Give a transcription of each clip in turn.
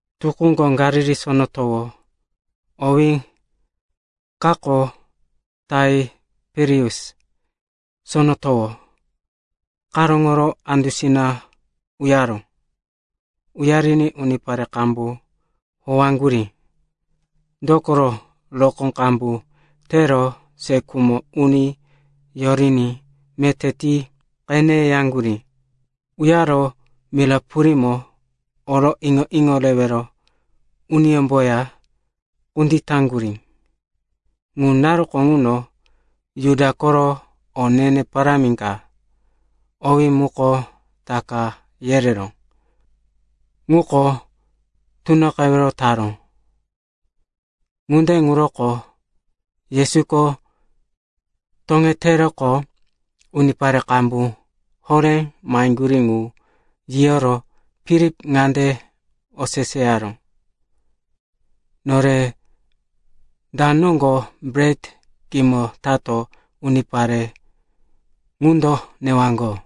Tukúko Galili Sono Towo (owí kako Taiperius Sono Towo) karóŋoro andusina uyaró. Uyariní unipare qambu howaŋgurí, dokoro rokó qambu tero se khumo uni yoriní meté ti qeneyaŋgurí. Uyaro mira purímo oro iŋo-iŋo rewero uniyómboya kunditaŋgurí. Ŋu naruko ŋuno Juda koro o ne-ne parámi ka, owí muko Taka yereró, ŋuko tunoqewero taró. Ŋunde ŋuroko Yesuko toŋeteroqo unipare qambu horé maheŋgurí ŋu yiyoro Filip ŋande oseseyaró, “Nore da noŋgo bret kimo tato unipare ŋundo newaŋgo?”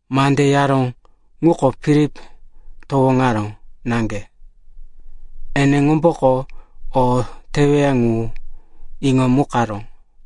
(Mande yaró ŋuko Filip towoŋaró naŋge. Eneŋomboko o teweya ŋu iŋomukaró.)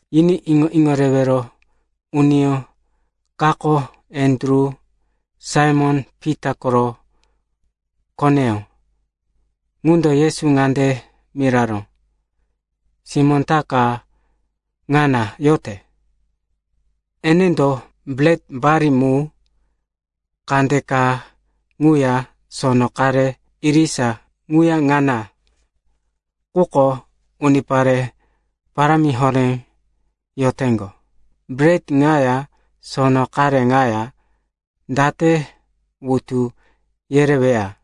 Yiní iŋo-iŋo rewero uniyó kako, Andru, Saimon-Pita koro koneyó, ŋundo Yesu ŋande miraró, “Simó ta ka ŋana yote, enendo bret bali mu kandeka quya sono qare irisa ŋana. Quko unipare parámi horé yoteŋgo. Bret ŋaya sono qare ŋaya date wutu yereweya?”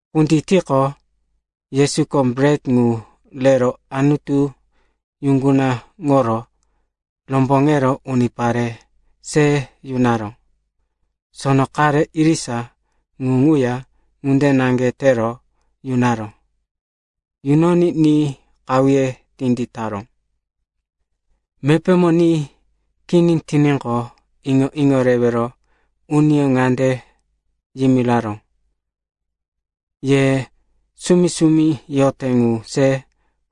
Kunditiqo, Yesuko bret ŋu rero Anutu yuŋgunaŋoro romboŋero unipare se yunaró. Sono qare irisa ŋu ŋuya ŋunde naŋge tero yunaró. Yunoní ni qahuye tinditaró. Mepémo ni kini tiníqo, iŋo-iŋo rewero uniyó ŋande yimiraró, “Ye sumi-sumi yote ŋu se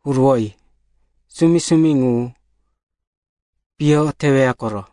huruwoyi. Sumi-sumi ŋu piyo teweya koro.”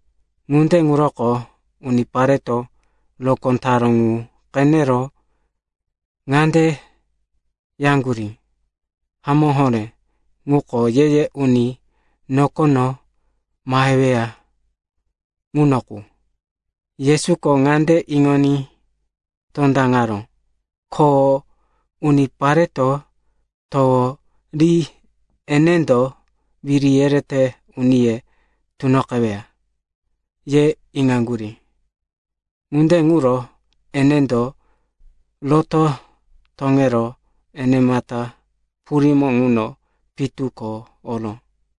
Ŋunde ŋuroko unipareto rokó taró ŋu qenero ŋande yaŋgurí, “Hamó horé, ŋuko ye-ye uni nokono maheweya ŋuno qu.” Yesuko ŋande iŋoní tondaŋaró, ko unipareto towo ri enendo wiri yerete uniye tunoqeweya, ye iŋaŋgurí. Ŋunde ŋuro enendo roto toŋero enemata purímo ŋuno pitu ko oró.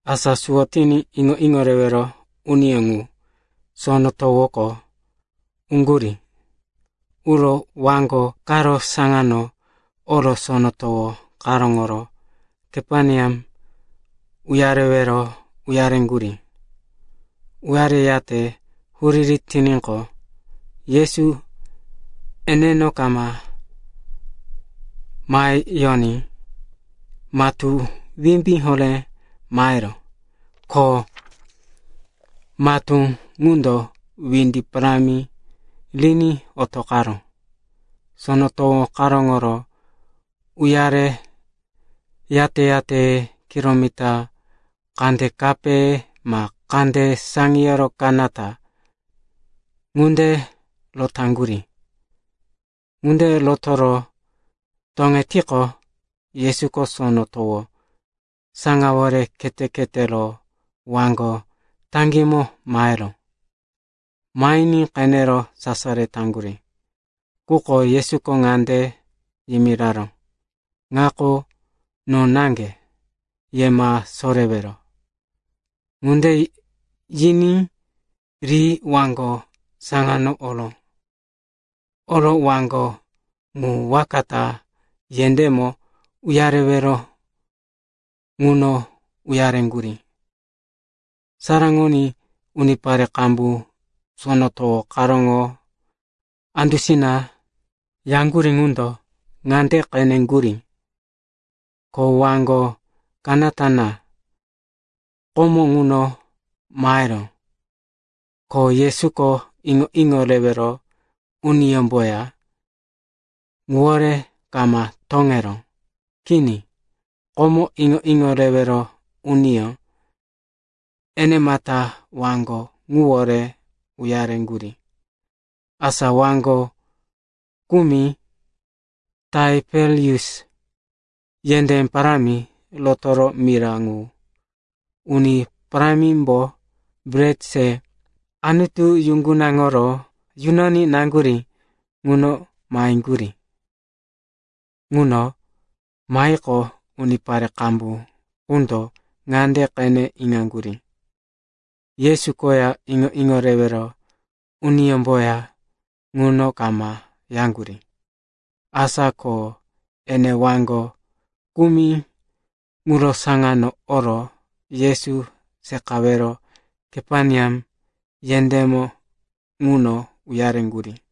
Asa suwo tiní iŋo-iŋo rewero uniyó ŋu sono towoko uŋgurí. Uro waŋgo karo saŋano oro sono towo karóŋoro Kaperneam uyarewero uyareŋgurí. Uyareyate huriri tiníqo, Yesu eneno kama maheyoní matú wimbí horé maheró, ko matú ŋundo windi parámi riní otoqaró. Sono towo karóŋoro uyare yate-yate kilomita kandekape ma kande saŋiyoro kanata ŋunde rotaŋgurí. Ŋunde rotoro toŋetiqo, Yesuko sono towo saŋawore khete-khetero waŋgo taŋgímo maheró. Mahiní qenero sasaro taŋgurí. Quko Yesuko ŋande yimiraró, “Ŋako no naŋge. Ye ma sorewero.” Ŋunde yiní ri waŋgo saŋano oró. Oro waŋgo ŋu waka ta yendémo uyarewero ŋuno uyareŋgurí. Saraŋoní unipare qambu sono towo karóŋo andusina yaŋgurí ŋundo ŋande qene iŋaŋgurí, ko waŋgo kanata naŋge komo ŋuno maheró. Ko Yesuko iŋo-iŋo rewero uniyómboya ŋuwore kama toŋeró. Kini. Komo iŋo-iŋo rewero uniyó enemata waŋgo ŋuwore uyareŋgurí. Asa waŋgo kumi Taiperius yendé parámi rotoro mira ŋu Uni Parámimbo bret se Anutu yuŋgunaŋoro yunoní naŋgurí ŋuno maheŋgurí. Ŋuno mahiqo, unipare qambu ŋundo ŋande qene iŋaŋgurí, Yesu koya iŋo-iŋo rewero uniyómboya ŋuno kama yaŋgurí. Asa ko ene waŋgo kumi ŋuro saŋano oro Yesu seqawero Kaperneam yendémo ŋuno uyareŋgurí.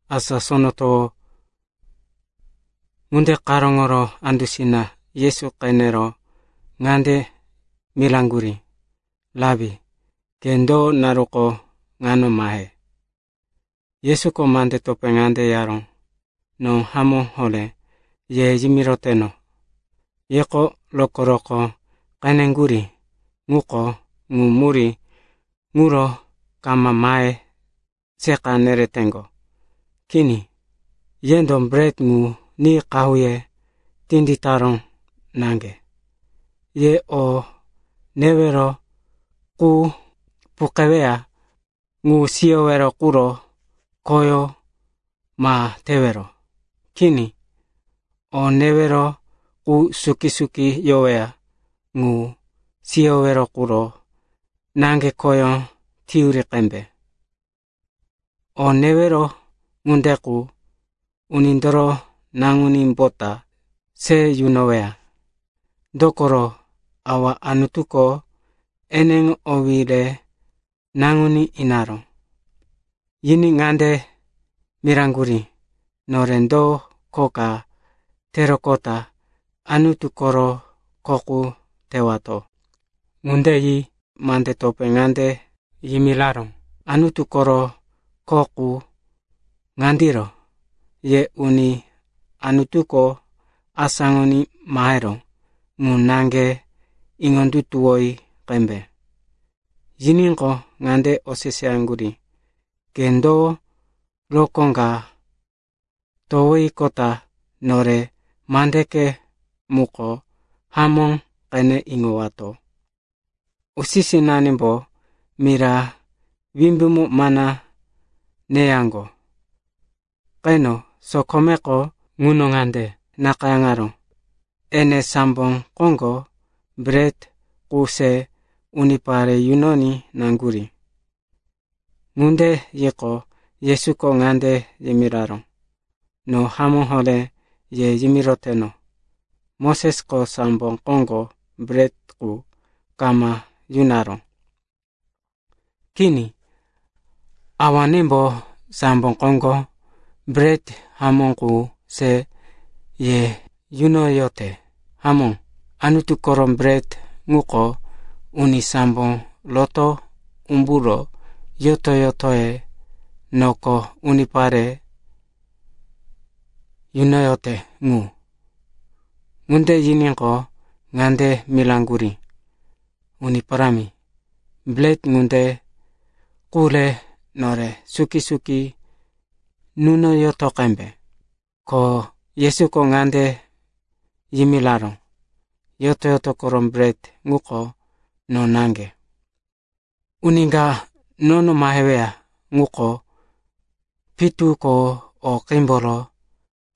Asa sono towo ŋunde karóŋoro andusina Yesu qenero ŋande miraŋgurí, “Rapi, ke do naruko ŋano mahe?” Yesuko mande topé ŋande yaró, “No hamó horé ye yimiroteno, yeko rokó-rokó qeneŋgurí, quko ŋu murí ŋuro kama mahe seqa nereteŋgo. Kini, yendo bret ŋu ni qahuye tinditaró naŋge. Ye o newero qu puqeweya ŋu siyowero quro khoyó ma tewero. Kini. O newero qu suki-suki yoweya ŋu siyowero quro naŋge khoyó teyuri qembe. O newero ŋunde qu, Unindoro Naŋunímbota se yunoweya. Dokoro Awa Anutuko eneŋo owí re Naŋuní inaró.” Yiní ŋande miraŋgurí, “Nore do kho ka teroqota Anutu koro kho qu tewato?” Ŋunde yi mande topé ŋande yimiraró, “Anutu koro kho qu ŋandiro. Ye uni Anutuko asáŋoní maheró ŋu naŋge iŋondutuwoyi qembe.” Yiníqo, ŋande oseseyaŋgurí, “Ke do rokó ka towiqota nore mandeke muko hamó qene iŋowato? Usi-sinanimbo mira wimbímo mana neyaŋgo. Qeno sokomeko ŋuno ŋande nakayáŋaró, ‘Ene sambo koŋgo bret qu se unipare yunoní naŋgurí.’” Ŋunde yiqo, Yesuko ŋande yimiraró, “No hamó horé ye yimiroteno, Mosesko sambo koŋgo bret qu kama yunaró. Kini. Awanembo sambo koŋgo bret hamó qu se ye yunoyote. Hamó, Anutu koro bret ŋuko uni sambo roto umburo yoto-yotoye noko unipare yunoyote ŋu.” Ŋunde yiníqo, ŋande miraŋgurí, “Uni Parámi, bret ŋunde qu re nore suki-suki nunoyoto qembe.” Ko Yesuko ŋande yimiraró, “Yoto-yoto koro bret ŋuko no naŋge. Uni ka nono maheweya ŋuko pitu ko o qímboro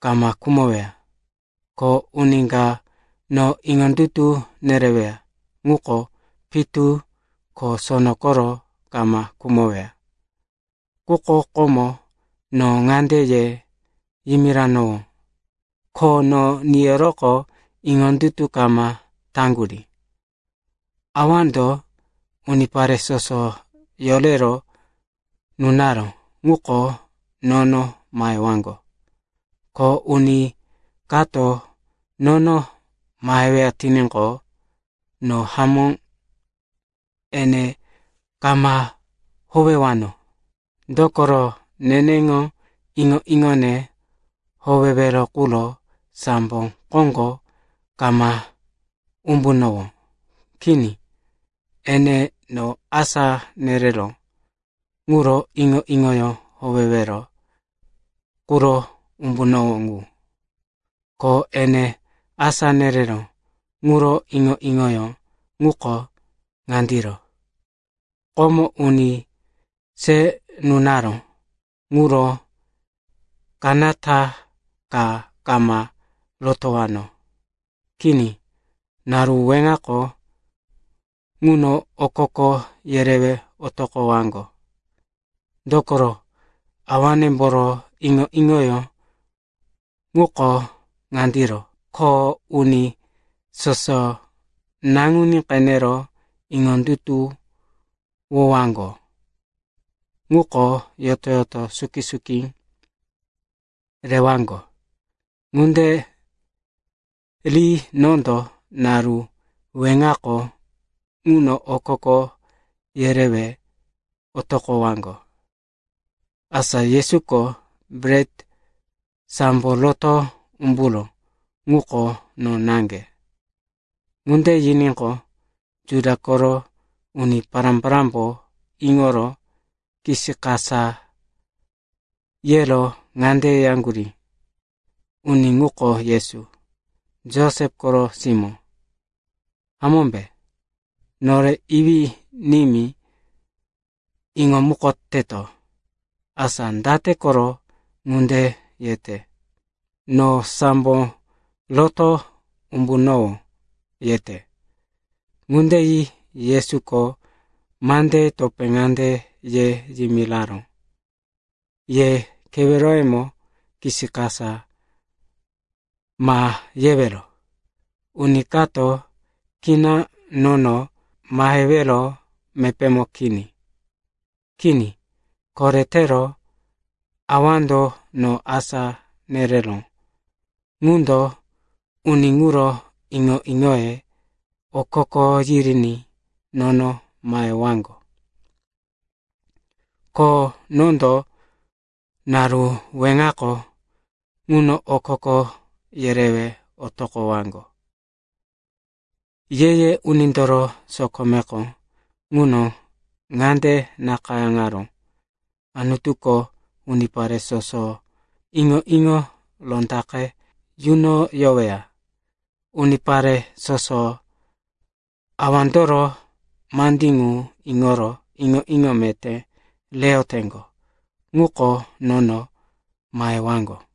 kama khumoweya. Ko uni ka no iŋondutu nereweya ŋuko pitu ko sono koro kama khumoweya. Quko komo no ŋande ye yimiranowó, ko no niyoroqo iŋondutu kama taŋgurí. Awando unipare soso yorero nunaró ŋuko nono mahewaŋgo. Ko uni kato nono maheweya tiníqo, no hamó ene kama howewano. Dokoro neneŋo iŋo-iŋone howewero quro sambo koŋgo kama umbunowó. Kini. Ene no asá nereró ŋuro iŋo-iŋoyó howewero quro umbunowó ŋu. Ko ene asá nereró ŋuro iŋo-iŋoyó ŋuko ŋandiro. Komo uni se nunaró ŋuro kanata ka kama rotowano. Kini, naru weŋako ŋuno okoko yerewe otoqowaŋgo. Dokoro Awanemboro iŋo-iŋoyó ŋuko ŋandiro, ko uni soso Naŋuní qenero iŋondutuwowaŋgo ŋuko yoto-yoto suki-suki rewaŋgo. Ŋunde ri nondo naru weŋako ŋuno okoko yerewe otoqowaŋgo.” Asa Yesuko, “Bret sambo roto umburó ŋuko no naŋge,” ŋunde yiníqo, Juda koro uni pará-parámbo iŋoro kisikasa yero ŋande yaŋgurí, “Uni ŋuko Yesu, Josep koro simó, hamómbe? Nore iwí-nimí iŋomukoteto. Asa date koro ŋunde yete, ‘No sambo roto umbunowó,’ yete?” Ŋunde yi Yesuko mandeye topé ŋande ye yimiraró, “Ye keweroyemo kisikasa ma yewero. Uni kato kina nono mahewero mepémo kini. Kini, koretero Awando no asá nereró ŋundo uni ŋuro iŋo-iŋoye okoko yiriní nono mahewaŋgo. Ko nondo naru weŋako ŋuno okoko yerewe otoqowaŋgo. Ye-ye unindoro sokomeko ŋuno ŋande nakayáŋaró, ‘Anutuko unipare soso iŋo-iŋo rondaqe yunoyoweya.’ Unipare soso Awandoro mandí ŋu iŋoro iŋo-iŋo meté reyoteŋgo ŋuko nono mahewaŋgo.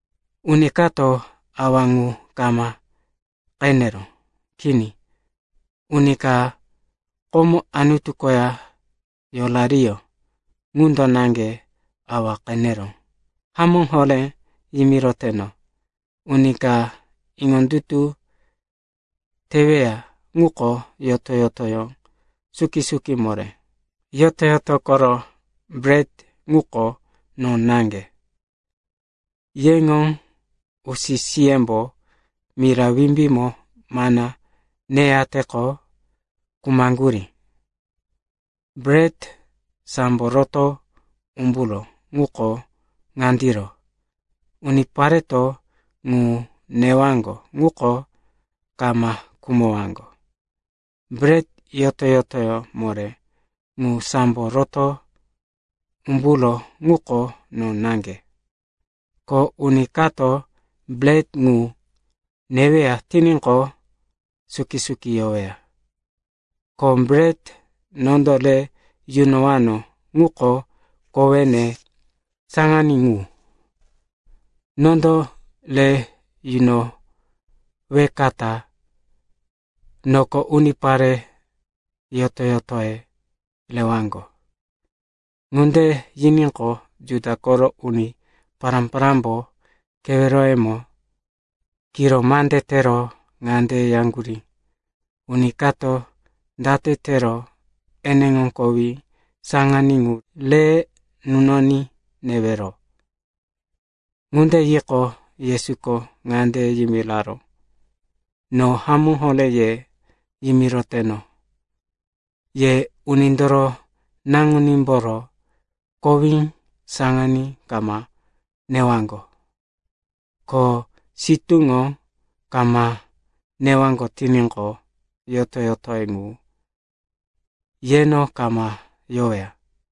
Uni kato Awa ŋu kama qeneró. Kini. Uni ka komo Anutu koya yorariyó, ŋundo naŋge Awa qeneró. Hamó horé yimiroteno, uni ka iŋondutu teweya ŋuko yoto-yotoyó suki-suki moré. Yoto-yoto koro bret ŋuko no naŋge. Yeŋo usi-siyembo mira wimbímo mana neyateqo khumaŋgurí. Bret sambo roto umburó ŋuko ŋandiro, unipareto ŋu newaŋgo ŋuko kama khumowaŋgo. Bret yoto-yotoyó moré ŋu sambo roto umburó ŋuko no naŋge. Ko uni kato bret ŋu neweya tiníqo, suki-suki yoweya. Ko bret nondo re yunowano ŋuko kowene saŋaní ŋu. Nondo re yunowekata noko unipare yoto-yotoye rewaŋgo.” Ŋunde yiníqo, Juda koro uni pará-parámbo keweroyemo kiro mande tero ŋande yaŋgurí, “Uni kato date tero eneŋo kowí saŋaní ŋu re nunoní newero?” Ŋunde yiqo, Yesuko ŋande yimiraró, “No hamó horé ye yimiroteno, ye Unindoro Naŋunímboro kowí saŋaní kama newaŋgo, ko sitúŋo kama newaŋgo tiníqo, yoto-yotoye ŋu yeno kama yoweya.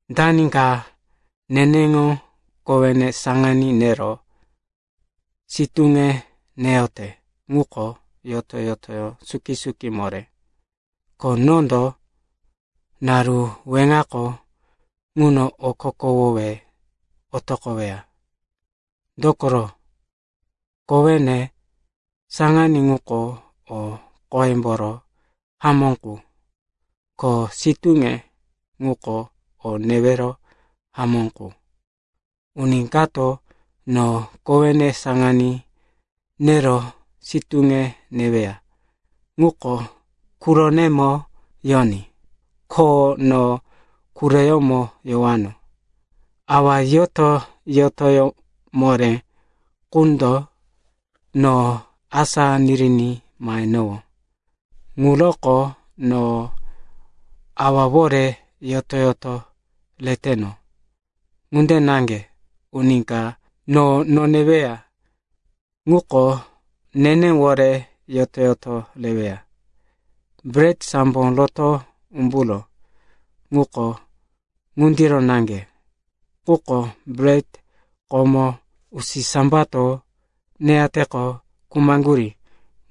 Dani ka neneŋo kowene saŋaní nero sitúne neyote ŋuko yoto-yotoyó suki-suki moré, ko nondo naru weŋako ŋuno okokowowe otoqoweya. Dokoro, kowene saŋaní ŋuko o qoyemboro hamó qu, ko sitúne ŋuko o newero hamó qu. Uni kato no kowene saŋaní nero sitúne neweya ŋuko quronemo yoní, ko no quroyómo yowano. Awa yoto-yotoyó moré ŋundo no asá niriní mahenowó, ŋuroko no Awawore yoto-yoto reteno. Ŋunde naŋge uni ka no noneweya ŋuko nenewore yoto-yoto reweya. Bret sambo roto umburó ŋuko ŋundiro naŋge, quko bret komo usisambato neyateqo khumaŋgurí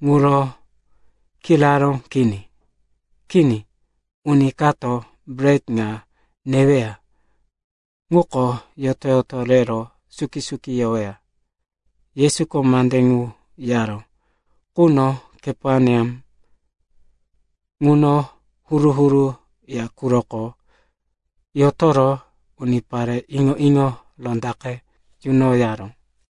ŋuro kiraró kini. Kini, uni kato bret ŋa neweya ŋuko yoto-yoto rero suki-suki yoweya.” Yesuko mande ŋu yaró quno Kaperneam ŋuno huru-huru ya quroko yotoro unipare iŋo-iŋo rondaqe yunoyaró.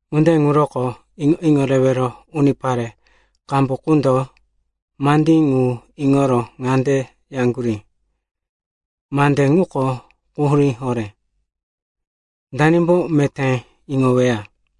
Ŋunde ŋuroko iŋo-iŋo rewero unipare qambu qundo mandí ŋu iŋoro ŋande yaŋgurí, “Mande ŋuko quhurí horé. Danimbo meté iŋoweya?”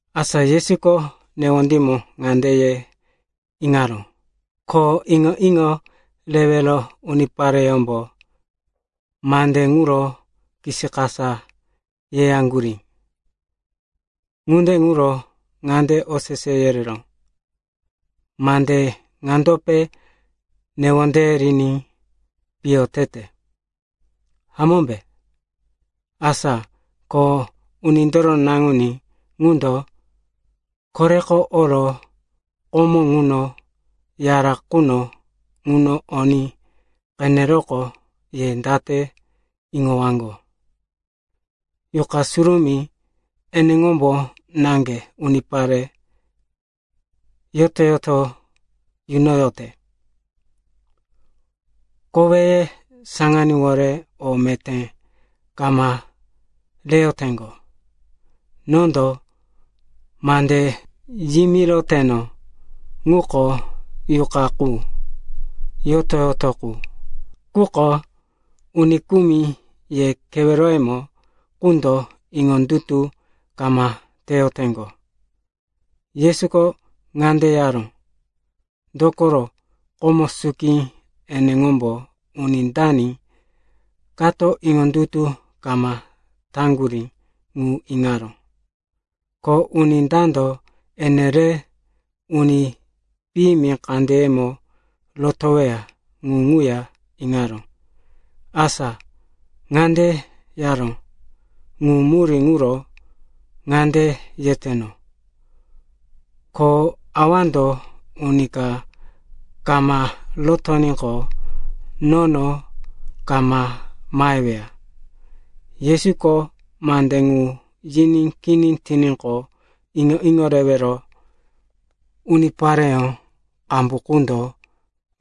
Asa Yesuko newondímo ŋande ye iŋaró, ko iŋo-iŋo rewero unipareyómbo mande ŋuro kisikasa yeyaŋgurí. Ŋunde ŋuro ŋande osese yereró, “Mande ŋandope newondeye riní piyo tete, hamómbe? Asa ko Unindoro Naŋuní ŋundo koreko oro komo ŋuno yara quno ŋuno oní qeneroqo ye date iŋowaŋgo? Yuqa Surumí eneŋombo naŋge unipare yoto-yoto yunoyote. Koweye saŋaníwore o meté kama reyoteŋgo. Nondo mande yimiroteno ŋuko Yuqa qu, yoto-yoto qu. Quko uni kumi ye keweroyemo qundo iŋondutu kama teyoteŋgo.” Yesuko ŋunde yaró, dokoro komo suki eneŋombo uni dani kato iŋondutu kama taŋgurí ŋu iŋaró. Ko uni dando ene re uni piyimi kandeyemo rotoweya ŋu ŋuya iŋaró. Asa ŋande yaró, “Ŋu murí ŋuro ŋande yeteno, ‘Ko Awando uni ka kama rotoníqo, nono kama maheweya.’” Yesuko mande ŋu yiní kini tiníqo, iŋo-iŋo rewero unipareyó qambu qundo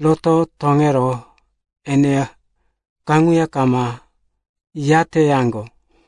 roto toŋero eneya kaŋuya kama yateyaŋgo.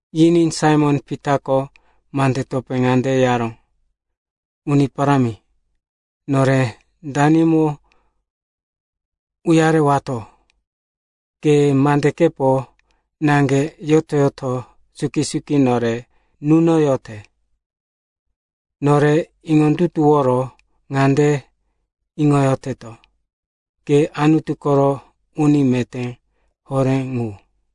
Yiní Saimon-Pitako mande topé ŋande yaró, “Uni Parámi, nore danimo uyarewato? Ke mandekepo naŋge yoto-yoto suki-suki nore nunoyote. Nore iŋondutuworo ŋande iŋoyoteto, ke Anutu koro Uni Meté Horé ŋu.”